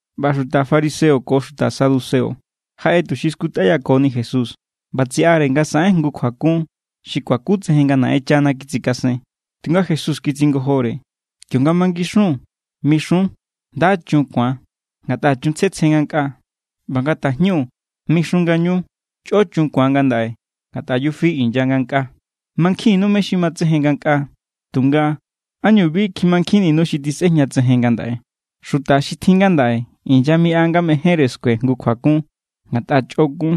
ꞌBa xuta fariseo ko xuta saduceo jaꞌe tuxi skutꞌayakoni Jesús. ꞌBa tsiꞌare nga saꞌen jngu kjuakun xi kuakutsejen nga Naꞌenchana kitsikasen. Tunga Jesús kitsingojore: —Kionga mangixun, mixun: “Nda= chun ku̱an, ngatꞌa chun tsjetsje ngankꞌaa.” ꞌBa nga tajñu, mixun ngañu: “Chꞌo chun ku̱an ngandaꞌe, ngatꞌa yufi inya ngankꞌaa.” Mankjinnu mé= xi matsejen ngankꞌaa, tunga, ¿ánñu bi kjimankjinninu xi tisꞌejñatsejen ngandaꞌe? Xuta xi tjin ngandaꞌe inyamiꞌa nga mejénre skue jngu kjuakun, ngatꞌa chꞌokun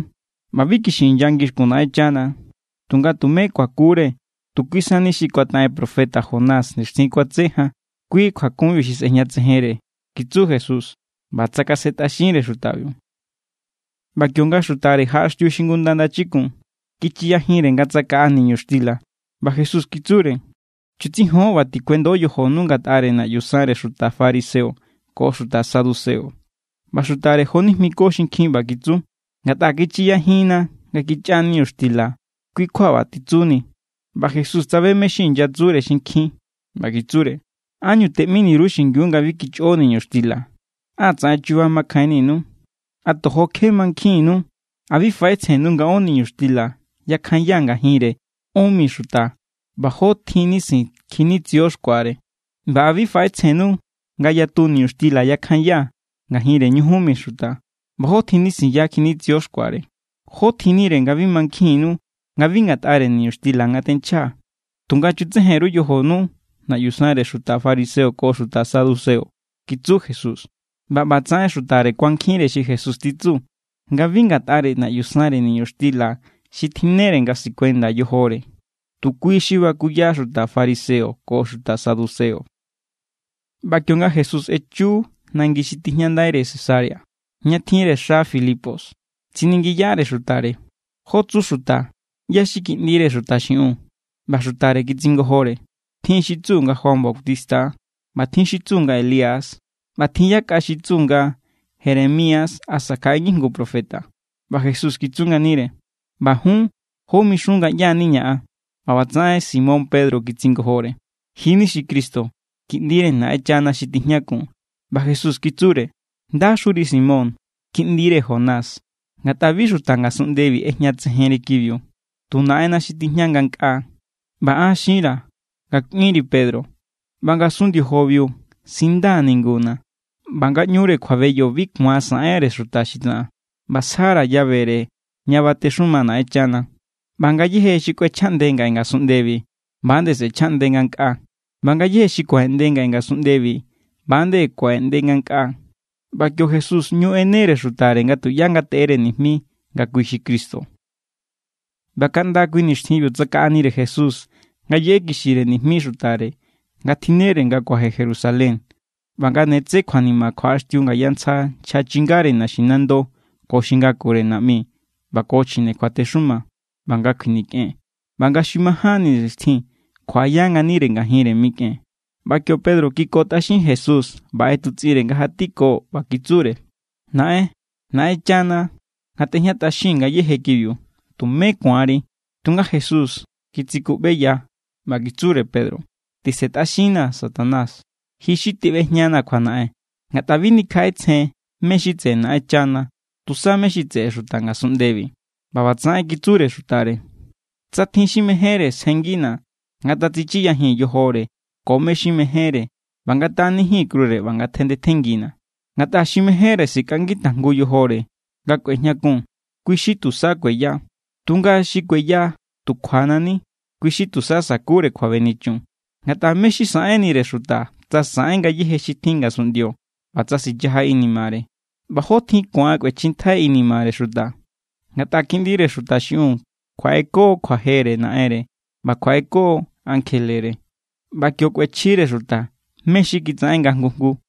ꞌba bi kixi inya ngixkun Naꞌenchana. Tunga tume kuakure tu kui sani xi kuataꞌen profeta Jonás nixtjin kuatse jan, kui kjuakunbiu xi sꞌejñatsejenre —kitsu Jesús ꞌba tsakasentꞌaxinre xutabiu. ꞌBa kionga xutare jaꞌaxtiu xingunda ndachikun, kichiyajinre nga tsakaꞌa niñuxtila. ꞌBa Jesús kitsure: —Chutsijon ꞌba tikuendo yojonu ngatꞌare naꞌyu sanre xuta fariseo ko xuta saduceo. ꞌBa xutare jonijmiko xinkjin ꞌba kitsu: —Ngatꞌa kichiyajinna nga kichꞌa niñuxtila kui= kjua ꞌba titsuni. ꞌBa Jesús tsabe mé= xi inyatsure xinkjin ꞌba kitsure: —¿Ánñu teꞌmini_ru xingiu nga bi kichꞌo niñuxtila? ¡Á tsaꞌen chuba makjainninu! ¿A tojo kje mankjinnu? ¿A bi faꞌetsjennu nga ón niñuxtila yakjanyaa̱ ngajinre ón mi xuta ꞌba jó tjin nisin kjinitsio xkuare? ¿ꞌBa a bi faꞌetsjennu nga yatu niñuxtila yakjanyaa̱ ngajinre ñujun mi xuta ꞌba jó tjin nisinya kjinitsio xkuare? ¿Jó tjinnire nga bi mankjinnu nga bi ngatꞌare niñuxtila nga tenchjaa̱? Tunga chutsejen_ru yojonu naꞌyu sanre xuta fariseo ko xuta saduceo —kitsu Jesús. ꞌBa ꞌbatsaꞌen xutare kuankjinre xi Jesús titsu, nga bi ngatꞌare naꞌyu sanre niñuxtila xi tjinnere nga sikuenda yojore, tu kui xi bakuya xuta fariseo ko xuta saduceo. ꞌBa kionga Jesús echu nangi xi tijñandaire Cesarea, ña tjinre xa Filipos, tsiningiyare xutare: —¿Jó tsu xuta, ꞌyá= xi Kiꞌndire Xuta xiꞌiun? ꞌBa xutare kitsingojore: —Tjin xi tsu nga Juan Bautista= ꞌba tjin xi tsu nga Elías. ꞌBa tjin yakꞌa xi tsu nga Jeremías asa kjaꞌe ngijngu profeta. ꞌBa Jesús kitsu nganire: —ꞌBa jun, ¿jó mixun nga ꞌyá=niña̱ an? ꞌBa ꞌbatsaꞌen Simón Pedro kitsingojore: —Ji= ni xi Cristo, Kiꞌndire Naꞌenchana xi tijñakun. ꞌBa Jesús kitsure: —¡Ndaxuri, Simón, kiꞌndire Jonás! Ngatꞌa bi xuta ngasunꞌndebi ꞌejñatsejenri kibiu, tu Naꞌenna̱ xi tijña ngankꞌaa. ꞌBa an xinra̱ nga kꞌuinri Pedro, ꞌba ngasun ndiojobiu sindaa̱ ninguna̱; ꞌba ngaꞌñure kjuabeyo bi ku̱an saꞌenre xuta xi tsaꞌan. ꞌBa sjara̱ llavere ña batexuma Naꞌenchana. ꞌBa ngayéje xi kꞌuechjaꞌnde ngaꞌe ngasunꞌndebi, ꞌba=nde sꞌe̱chjaꞌnde ngankꞌaa. ꞌBa ngayéje xi kuaꞌeꞌnde ngaꞌe ngasunꞌndebi, ꞌba=nde kuaꞌeꞌnde ngankꞌaa. ꞌBa kio Jesús ꞌñu ꞌenere xutare nga tuꞌyá ngateꞌere nijmi nga kui xi Cristo. ꞌBa kaꞌnda kui nixtjinbiu tsakaꞌanire Jesús nga yeꞌekixire nijmi xutare nga tjinnere nga kuaje Jerusalén, ꞌba nga ne tse kjuanima kjuaꞌaxtiu ngaya ntsja nchja chingare naxinando ko xi ngakure naꞌmi ꞌba ko chjine kjuatexuma, ꞌba nga kjuinikꞌen, ꞌba nga xi majánni nixtjin kjuaꞌaya nganire ngajinre mikꞌen. ꞌBa kio Pedro kikotꞌaxin Jesús ꞌba ꞌetutsꞌinre nga jatiko ꞌba kitsure: —¡Naꞌen, Naꞌenchana ngatꞌejñatꞌaxin ngayéje kibiu! ¡Tumé ku̱anri! Tunga Jesús kitsikuꞌbeya ꞌba kitsure Pedro: —¡Tisentꞌaxinnaa̱, Satanás! Ji xi teꞌbejñanaa̱ kjuanaꞌen. Ngatꞌa bi nikjaꞌetsjen mé= xi tseꞌe Naꞌenchana, tusa mé= xi tseꞌe xuta ngasunꞌndebi. ꞌBa ꞌbatsaꞌen kitsure xutare: —Tsa tjin xi mejénre sjenngina̱, ngatatsichiyajin yojore ko mé= xi mejénre ꞌba ngataꞌanijin krure ꞌba ngatjandetjenngina̱. Ngatꞌa xi mejénre sikꞌangi tajngu yojore nga kꞌuejñakun, kui= xi tusa kueya. Tunga xi kueya tu kjuana̱ ni, kui= xi tusa sakure kjuabenichun. Ngatꞌa, ¿mé= xi saꞌenire xuta tsa saꞌen ngayéje xi tjin ngasunꞌndio, ꞌba tsa sichaja inimare? ¿ꞌBa jó tjin ku̱an kꞌuechjintjai inimare xuta? Ngatꞌa Kiꞌndire Xuta xiꞌiun kjuaꞌeko kjuajere Naꞌenre ꞌba kjuaꞌeko ankjelere, ꞌba kio kꞌuechjire xuta mé= xi kitsaꞌen nga jngu jngu.